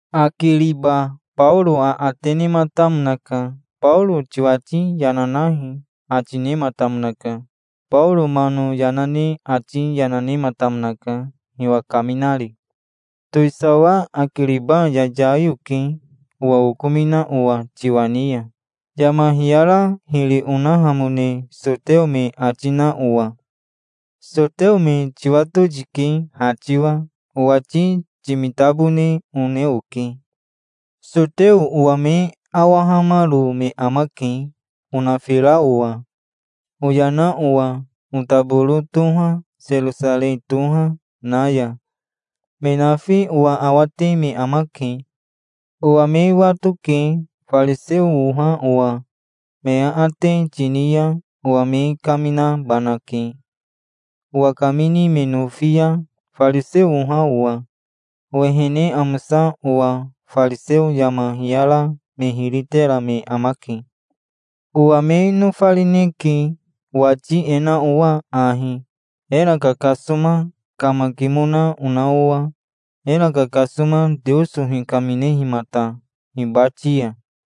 Akiriba Baoro aate nematamonaka. "Baoro tiwati yana nahi", ati nematamonaka. Baoro mano yana ne ati yana nematamonaka, hiwa kaminari. "Towisawa Akiriba yayai oke, owa okomina owa tiwa ni ya, yama hiyara hiri onahamone soteo me ati na owa. Soteo me tiwato tike ha tiwa. Owati timitabone one oke. Soteo owa me awahamaro me amake, onafira owa, oyana owa otaboro toha, Serosarei toha, na ya. Me nafi owa awate me amake. Owa me watoke, fariseo oha owa. Me aate tini ya owa me kaminabanake, owa kamini me nofi ya, fariseo oha owa, owehene amosa owa. Fariseo yama hiyara me hiri tera me amake. Owa me nofarineke, owati e na owa ahi, era kakasoma kamakimona ona owa, era kakasoma Teoso hikaminehimata hibati ya.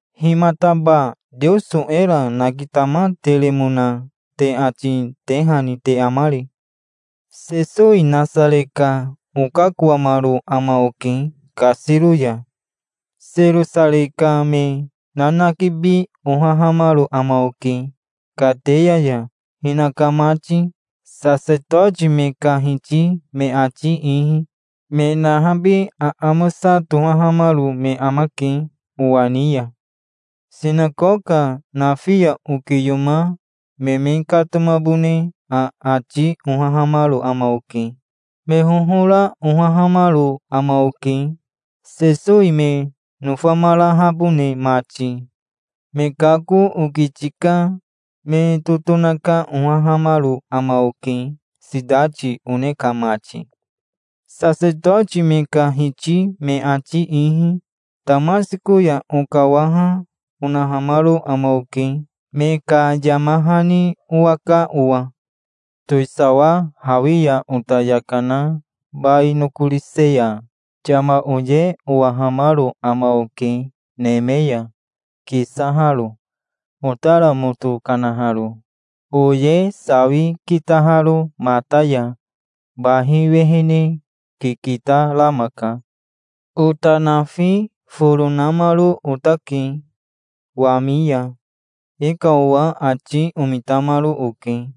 Himataba Teoso era nakitamateremona te ati tehani te amari?" "Sesowi Nasare ka okakoamaro ama oke kasiro ya. Serosarei ka me nanakibi ohahamaro ama oke kateya ya, hinaka mati, sasetoti me ka hiti me ati ihi. Me nahabi aamosa tohahamaro me amake owa ni ya. Sinakoka nafi ya okiyoma me me katomabone aati ohahamaro ama oke. Me hohora ohahamaro ama oke, Sesowi me nofamarahabone mati. Me kako okiti ka me totonaka ohahamaro ama oke sitati one ka mati". Sasetoti me ka hiti me ati ihi Tamasiko ya okawaha, onahamaro ama oke, me ka yama hani owaka owa. Towisawa, hawi ya ota yaka na bai nokorise ya yama oye owahamaro ama oke, neme ya kisaharo, otara moto kanaharo, oye sawi kitaharo mata ya. Bahi wehene kikita rama ka. Ota nafi foro namaro otake wami ya. E ka owa ati omitamaro oke,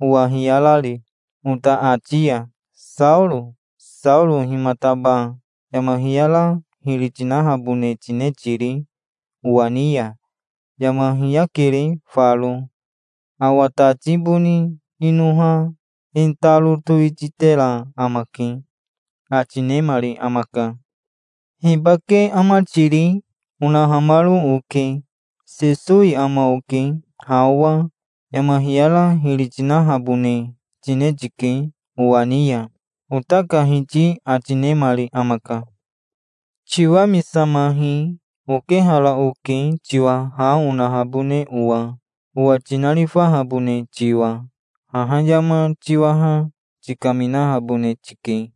owa hiyarari, ota ati ya. 'Saoro Saoro himataba yama hiyara hiri tinahabone tine tiri owa ni ya? Yama hiyakere faro. Awa tati boni inoha e taro towititera amake', ati nemari amaka". "'Hibake ama tiri?' onahamaro oke". "'Sesowi ama oke. Ha owa yama hiyara hiri tinahabone tine tike owa ni ya', ota ka Hiti ati nemari amaka. 'Tiwamisamahi. Okehara oke, tiwa ha onahabone owa, owa tinarifahabone tiwa. Haha yama tiwaha tikaminahabone tike.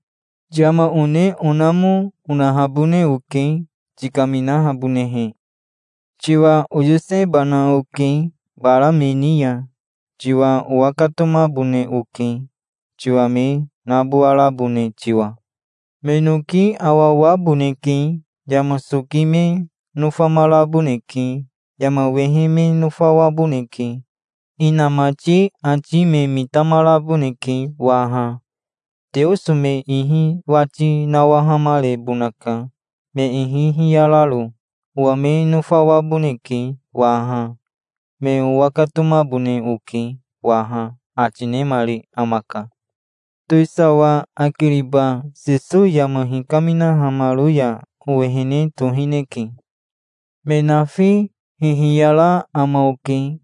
Yama one onamo, onahabone oke, tikaminahabonehe. Tiwa oyosebana oke bara me ni ya. Tiwa owakatomabone oke, tiwa me nabowarabone tiwa. Me noki awawaboneke. Yama soki me nofamaraboneke. Yama wehe me nofawaboneke. Inamati ati me mitamaraboneke waha. Teoso me ihi wati nawahamarebonaka, me ihi hiyararo. Owa me nofawaboneke waha. Me owakatomabone oke waha', ati nemari amaka". "Towisawa Akiriba Sesowi yama hikaminahamaro ya owehene tohineke. Me nafi hihiyara ama oke,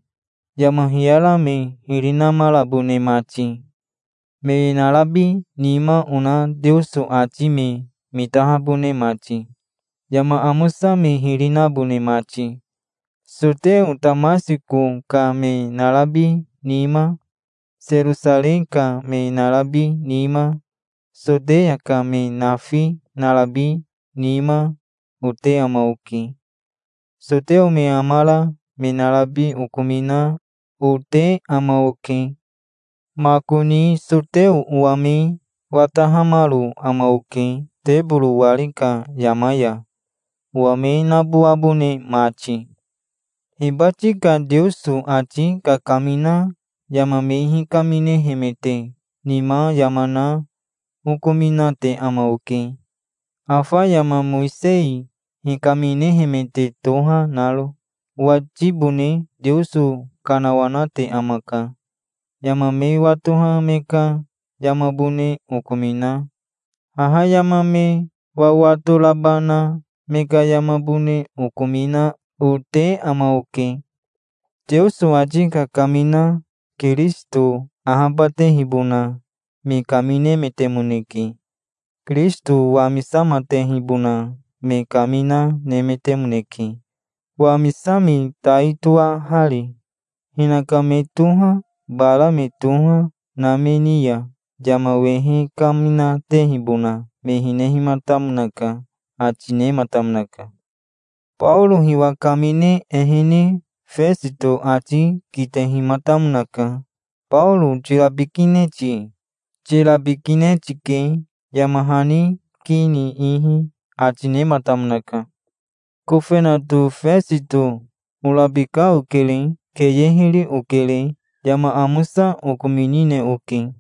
yama hiyara me hiri namarabone mati, me narabi nima ona Teoso ati me mitahabone mati, yama amosa me hiri nabone mati. Soteo Tamasiko ka me narabi nima, Serosarei ka me narabi nima, Soteya ka me nafi narabi nima, ote ama oke. Soteo me amara me narabi okomina, ote ama oke. Makoni soteo owa me watahamaro ama oke teboro wari ka yama ya, owa me nabowabone mati". "Hibati ka Teoso ati kakamina yama me hikaminehemete nima yama na okominate ama oke, afa yama Mowisei hikaminehemete toha naro. Owatibone Teoso kanawanate amaka. Yama me watoha me ka yamabone okomina, haha yama me wawato raba na me ka yamabone okomina, ote ama oke. Teoso ati kakamina Kirisito ahabatehibona me kaminemetemoneke. Kirisito wamisamatehibona me kamina nemetemoneke, wamisami tai toahari. Hinaka me toha, bara me toha, na me ni ya yama wehe kaminatehibona me hinehimatamonaka", ati nematamonaka. Baoro hiwa kamine ehene Fesito ati kitehimatamonaka. "Baoro tirabikine ti? Tirabikine tike, yama hani ki ni ihi", ati nematamonaka. "Kofenato Fesito orabika okere. Keye hiri okere. Yama amosa okominine oke.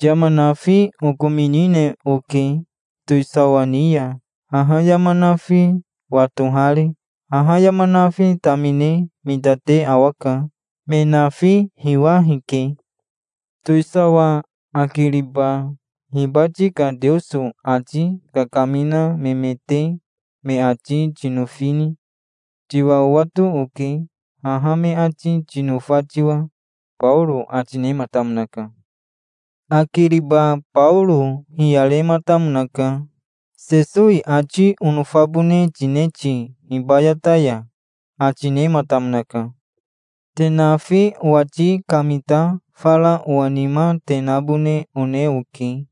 Yama nafi okominine oke towisawa ni ya, haha yama nafi watohari. Haha yama nafi tamine mitate awaka. Me nafi hiwa hike. Towisawa Akiriba hibati ka Teoso ati kakamina memete me ati tinofini? Tiwa owato oke, haha me ati tinofa tiwa", Baoro ati nematamonaka. Akiriba Baoro hiyarematamonaka. "Sesowi ati onofabone tine ti hibayata ya?" ati nematamonaka. "Te nafi owati kamita fara owa nima te nabone one oke.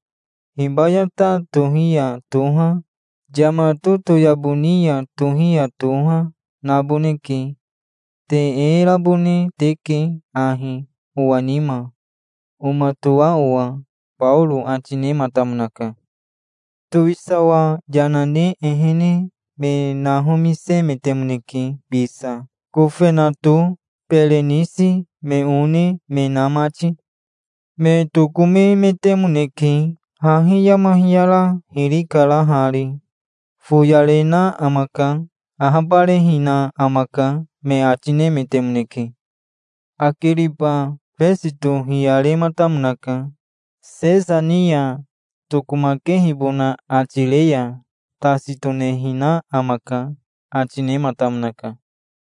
Hibayata tohi ya toha, yama totoyabo ni ya tohi ya toha, naboneke. Te e rabone teke ahi owa nima, omatoa owa", Baoro ati nematamonaka. Towisawa yana ne ehene me nahomisemetemoneke bisa, kofenato, Berenisi, me one, me na mati. Me tokomemetemoneke. "Hahi yama hiyara hiri kara hari. Foyarena amaka. Ahabarehina amaka", me ati nemetemoneke. Akiriba Fesito hiyarematamonaka. "Sesa ni ya tokomakehibona ati re ya tasi tonehina amaka", ati nematamonaka.